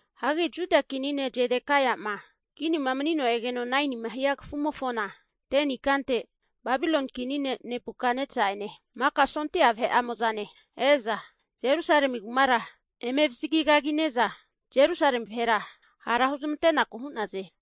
Hagi Juda kini ne' Zedekaia'ma kinima mani'negeno 9nima hia kafumofona 10ni ikante, Babiloni kini ne' Nebukatnesa'ene maka sondia vahe'amo'zane e'za, Jerusalemi kumara eme avazagi kagine'za Jerusalemi vahera hara huzmante'naku hu'naze.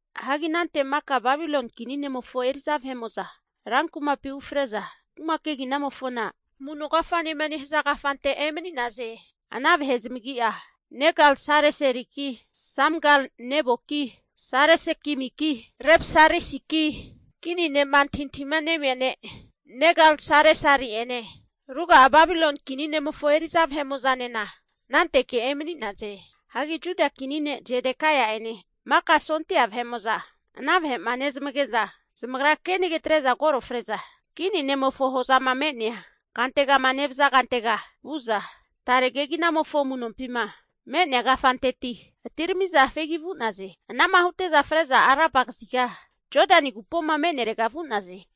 Hagi anante maka Babiloni kini ne'mofo eri'za vahe'mo'za rankumapi ufre'za, kuma keginamofona Amu'no Kafanema nehaza kafante emani'naze. Ana vahe zamagi'a, Negal-Sareseliki Samgal-Neboki Sarsekimiki Rabsarisiki kini ne'ma antahintahima nemia ne' Negal-Sareseli'ene ruga'a Babiloni kini ne'mofo eri'za vahemo'zanena ananteke emani'naze. Hagi Juda kini ne' Zedekaia'ene maka sondia vahe'mo'za ana vahe'ma nezamage'za, zamagra kenage atre'za koro fre'za, kini ne'mofo hozama me'nea kantegama nevaza kantega vu'za, tare keginamofo amu'nompima me'nea kafanteti atirami'za fegi vu'naze. Ana'ma hute'za fre'za Araba kaziga Jodani agupoma me'nerega vu'naze.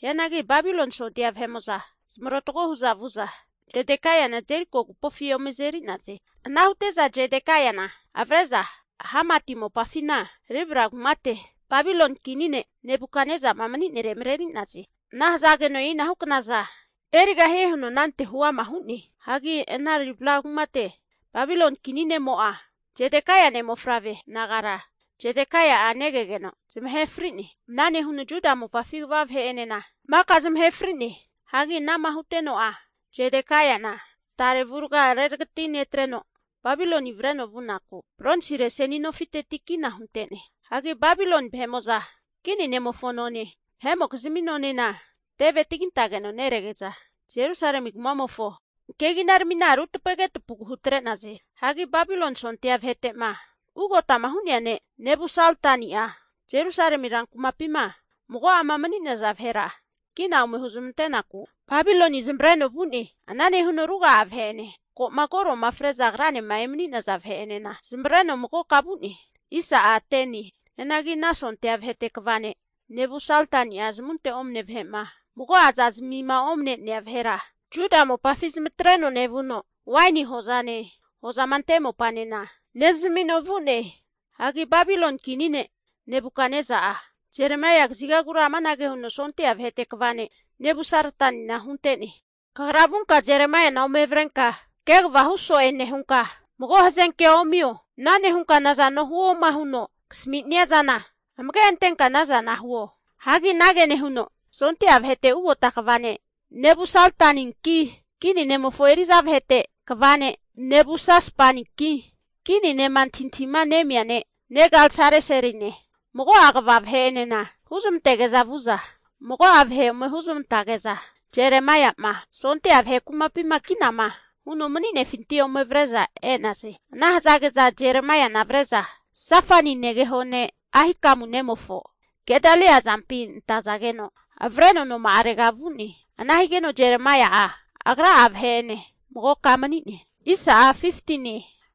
Hianagi Babiloni sondia vahe'mo'za zamarotago hu'za vu'za, Zedekaiana Jeriko agupofi ome azeri'naze. Ana hute'za Zedekaiana avre'za Hamati mopafina Ribla kumate Babiloni kini ne' Nebukatnesa'ma mani'nere mareri'naze. Ana hazageno e'inahu knaza erigahie huno anante huama hu'ne. Hagi ana Ribla kumate, Babiloni kini ne'mo'a Zedekaia ne' mofavre nagara, Zedekaia'a negegeno zamahe fri'ne. Ana nehuno Juda mopafi kva vahe'enena maka zamahe fri'ne. Hagi ana'ma huteno'a Zedekaiana tarega avua reragati netreno Babiloni avreno vunaku bronsire seni nofiteti kina hunte'ne. Hagi Babiloni vahe'mo'za kini ne'mofo none, vahe'mokizmi nonena teve tagintageno nerege'za, Jerusalemi kuma'mofo keginaramina rutapage tapagu hutre'naze. Hagi Babiloni sondia vahete'ma ugotama hu'nea ne' Nebusaradani'a Jerusalemi rankumapima mago'ama mani'naza vahera kina ome huzmante'naku Babiloni zamavareno vu'ne. Ana nehuno ruga'a vahe'ene, ko'ma koro'ma fre'za agranema emani'naza vahe'enena zamavareno magoka vu'ne. Hianagi ana sondia vahete kva ne' Nebusaradani'a zamunte omane vahe'ma mago'a zazimima omane'nea vahera Juda mopafi zamatreno nevuno, waini hozane hozama ante mopanena nezamino vu'ne. Hagi Babiloni kini ne' Nebukatnesa'a, Jeremaia kazigagura amanage huno sondia vahete kva ne' Nebusaradanina hunte'ne. Kagra vunka Jeremaiana ome avrenka kegavahu so'e nehunka mago hazenkea omio. Ana nehunka nazano huoma huno kasaminia zana amage antenka anazana huo. Hagi anage nehuno sondia vahete ugota kva ne' Nebusaradaninki, kini ne'mofo eri'za vahete kva ne' Nabusasbaninki kini ne'ma antahintahima nemia ne' Negal-Sareseline mago'a kva vahe'enena huzmantege'za vu'za, mago'a vahe ome huzmantage'za Jeremaia'ma sondia vahe kumapima kinama huno mani'nefinti ome avre'za e'naze. Ana hazage'za Jeremaiana avre'za Safani negeho ne' Ahikamu nemofo Gedalia azampi antazageno avreno noma'arega vu'ne. Ana higeno Jeremaia'a agra'a vahe'ene magoka mani'ne.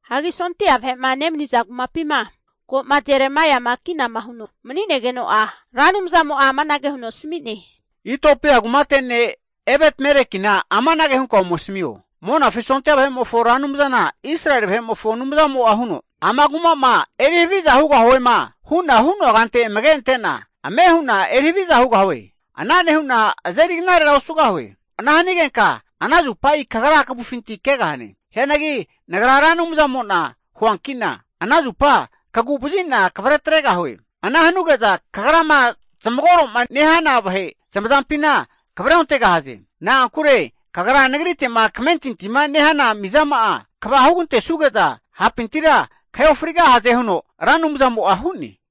Hagi sondia vahe'ma nemaniza kumapima ko'ma Jeremaia'ma kinama huno mani'negeno'a Ra Anumzamo'a amanage huno asami'ne. Itiopia kumate ne' Ebetmelekina amanage hunka ome asamio. Monafi sondia vahe'mofo Ra Anumzana Israeli vahe'mofo Anumzamo'a huno, Ama kuma'ma eri haviza hugahuema hu'na hu'noa kante amage ante'na ame hu'na eri haviza hugahue. Ana nehu'na azeri knarera osugahue. Ana hanigenka ana zupa kagra kavufinti kegahane. Hianagi Nagra Ra Anumzamo'na huanki'na, ana zupa kagu'vazi'na kavretregahue. Ana hanuge'za kagrama zamagoro'ma nehana vahe zamazampina kavreontegahaze. Na'ankure kagra Nagrite'ma kamentintima nehana mizama'a kva hugantesuge'za hapintira kahe ofrigahaze, huno Ra Anumzamo'a hu'ne.